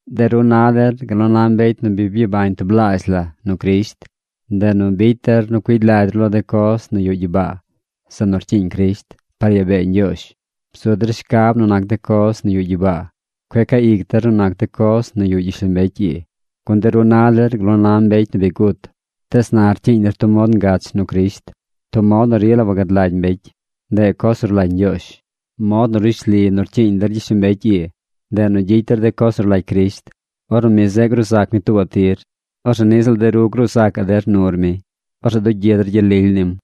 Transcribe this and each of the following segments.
De ru na der gal nu na mbecy nu bi byabañ tublaazh la nu Crisht. Ndeꞌ nu bicy der nu cuigy lagy ru lo de coz nu yuꞌ gyibaa, zeꞌ nu rcyiiñ Crisht, par yaa bee Ñgyoozh. Bzu der shcab nu nac de coz nu yuꞌ gyibaa. Cueꞌ caa ic der nu nac de coz nu yuꞌ gyishlombecy ii. Gun de ru na der gal nu na mbecy nu bi gut, tees na rcyiiñ der tub mod ngach nu Crisht, tub mod nu rila wagad lagy mbecy. Ndeꞌ coz nu rlagy Ñgyoozh. Mod nu rishli nu rcyiiñ der gyishlombecy ii, ndeꞌ nu gyicy der de coz nu rlagy Crisht. Ornu mi zeꞌ gruu zac mi tuubaꞌ tir, orzeꞌ niꞌ ziꞌl de ru gruu zacaꞌ der nur mi. Orzeꞌ dugyi der gyel lily nim.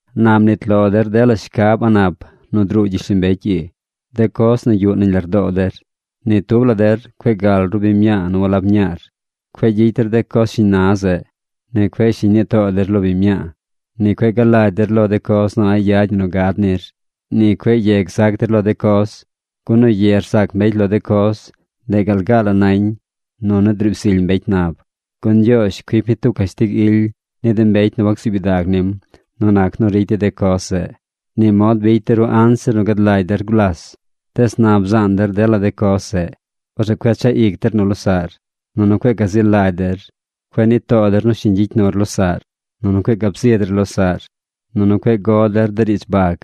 Na mnit lo der dela shcab a̱ꞌ nap nu druu gyishlombecy ii, de coz nu yuꞌ nañ lardoo der. Ni tub la der cueꞌ gal ru biñ mñaa nu walab mñaar. Cueꞌ gyicy der de coz shiñ na zeꞌ. Ni cueꞌ shiñ nii too der lo biñ mñaa. Ni cueꞌ galagy der lo de coz nu a̱ꞌ yad ñi nu gad nir. Ni cueꞌ ye gzac der lo de coz. Gun nu ye rzac mbecy lo de coz, de ndeꞌ gal gaa la nañ nu nu driib zily mbecy nab. Gun Ñgyoozh cuic mi tub cashtig ily ni de mbecy nu wacsuub gyidag nim nu nac nu ricy dey de coz zeꞌ. Ni mod bicy de ru anzir nu gad lagy der gulas. Tees na bzaan der dela de coz zeꞌ. Orzeꞌ cueꞌ chaꞌ ic der nu losaꞌr. Nunu cueꞌ gazi lagy der. Cueꞌ nii too der nu shiñ gyicy nur losaꞌr. Nunu cueꞌ gab zi der losaꞌr. Nunu cueꞌ go der riidz bag.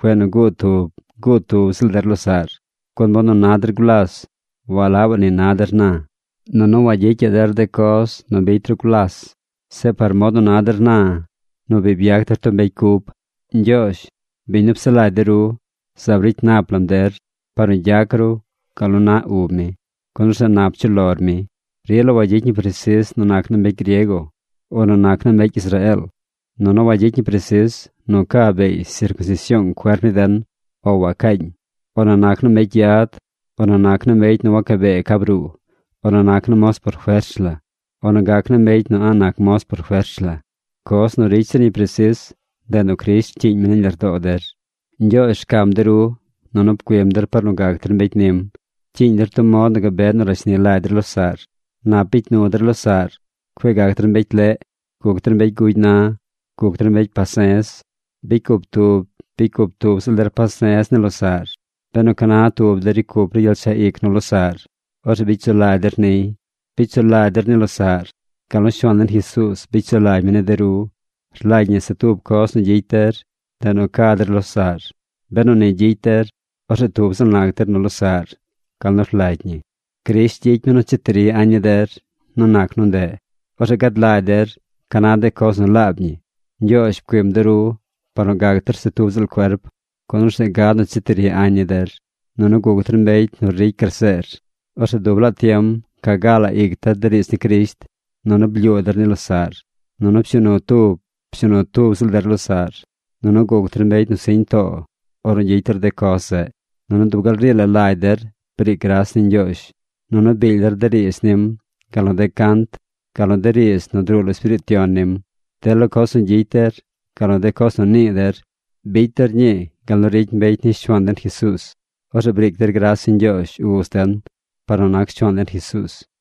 Cueꞌ nu guu tub, guu tub ziꞌl der losaꞌr, gun mod nu na der gulas walabaꞌ ni na der na. Nunu wagyicyaꞌ der de coz nu bicy ru gulas. Zeꞌ par mod nu na der na, nu bi byac der tub mbecy cub. Ñgyoozh, biñ nu psaꞌ lagy de ru, zaab ricy nap lam der par nu gyac ru gal nu naꞌ ub mi, gun orzeꞌ nap chuꞌ lor mi. Rila wagyicy ñi presis nu nac naa mbecy griego o nu nac naa mbecy Israeel. Nunu wagyicy ñi presis nu ca beey sircunsision cuerp ni den o wacaañ, o nu nac naa mbecy yad, o nu nac naa mbecy nu waca bee ca bruu, o nu nac naa moz por fers la, o nu gac na mbecy nu a̱ꞌ nac moz por fers la. Coz nu ricy zir ñi presis, ndeꞌ nu Crisht rcyiiñ mi nañ lardoo der. Ñgyoozh rcam de ru. Nunu pcuim der par nu gac der mbecy nim. Pcyiiñ der tub mod nu gabe nu rashni lagy der losaꞌr. Nap bicy nu der losaꞌr. Cueꞌ gac der mbecy leꞌ. Guc der mbecy gugy na. Guc der mbecy pase̱z. Bicy cup tub bicy cup tub ziꞌl der pase̱z ni losaꞌr. Benu ca na tub der ricy cup ru gyel chaꞌ ic nu losaꞌr, orzeꞌ bicy sulagy der niy. Bicy sulagy der ni losaꞌr, gal nu Shuaan den Jesuuz bicy sulagy mi ni de ru. Rlagy ñi se tub coz nu gyicy der. Ndeꞌ nu ca der losaꞌr. Benu ni gyicy der, orzeꞌ tub ziꞌl nac der nu losaꞌr gal nu rlagy ñi. Crisht gyicy mi nu cheti ri añ ni der nu nac nu ndeꞌ. Orzeꞌ gad lagy der ca na de coz nu laab ñi. Ñgyoozh pcuim de ru par nu gac der se tub ziꞌl cuerp, gun orzeꞌ gad nu cheti ri añ ni der. Nunu guc der mbecy nu ricy graseer. Orzeꞌ dub laa tiem ca gaa la ic der de riidz ni Crisht, nunu blyuu der ni losaꞌr. Nunu pshuu nu tub pshuu nu tub ziꞌl der losaꞌr. Nunu guc der mbecy nu siñ too ornu gyicy der de coz zeꞌ. Nunu dub gal rii la lagy der briic gras ni Ñgyoozh. Nunu biil der de riidz nim, gal nu de cant, gal nu de riidz nu druu lo Espiriit Yon nim. Dela coz nu gyicy der, gal nu de coz nu nii der, bicy der ñii gal nu ricy mbecy ni Shuaan den Jesuuz. Orzeꞌ briic der gras ni Ñgyoozh Uz den par nu nac Shuaan den Jesuuz.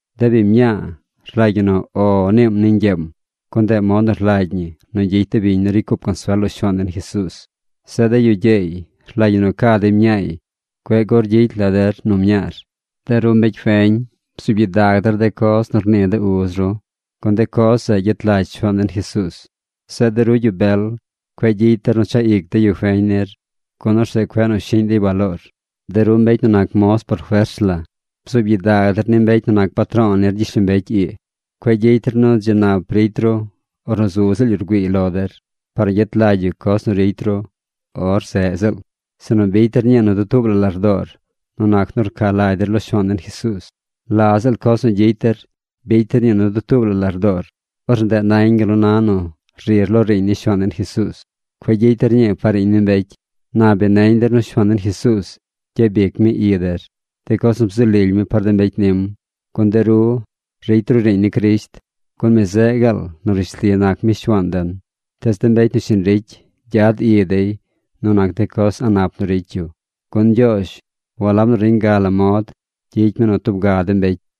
De biñ mñaa, rlagy ñi nu “O” niim ni ñgyeem, gun ndeꞌ mod nu rlagy ñi nu gyicy de biñ nu ricy cup consuel lo Shuaan den Jesuuz. Zeꞌ de yu gyeey rlagy ñi nu ca dey mñaay. Cueꞌ gur gyicy la der nu mñaar. De ru mbecy feñ, bzuub gyidag der de coz nu rnii de uz ru, gun de coz zeꞌ gyet lagy Shuaan den Jesuuz. Zeꞌ de ru yu bel, cueꞌ gyicy der nu chaꞌ ic de yu feñ nir, gun orzeꞌ cueꞌ nu shiꞌñ dey baloor. De ru mbecy nu nac moz por fers la, bzuub gyidag der ni mbecy nu nac patro̱o̱ nir gyishlombecy ii. Cueꞌ gyicy der nu dzi nap ricy ru ornu zu ziꞌl yu rgüiiy lo der, par nu gyet lagy yu coz nu ricy ru or zeꞌ ziꞌl, sinu bicy der ñii nu dutuub la lardoor nu nac nu rca lagy der lo Shuaan den Jesuuz. La ziꞌl coz nu gyicy der, bicy der ñii nu dutuub la lardoor. Orzeꞌ ndeꞌ nañ gal nu na nu rir lo riiñ ni Shuaan den Jesuuz. Cueꞌ gyicy der ñii par riiñ ni mbecy. Na bi neñ der nu Shuaan den Jesuuz gyabic mi i der, de coz nu bzu lily mi par de mbecy nim. Gun de ru ricy ru riiñ ni Crisht, gun mi zeꞌ gaal nu rishli nac mi Shuaan den. Tees de mbecy nu shiñ ricy, gyad i dey nu nac de coz a̱ꞌ nap nu ricy yu, gun Ñgyoozh walab nu reñ ga la mod gyicy mi nu tub ga de mbecy.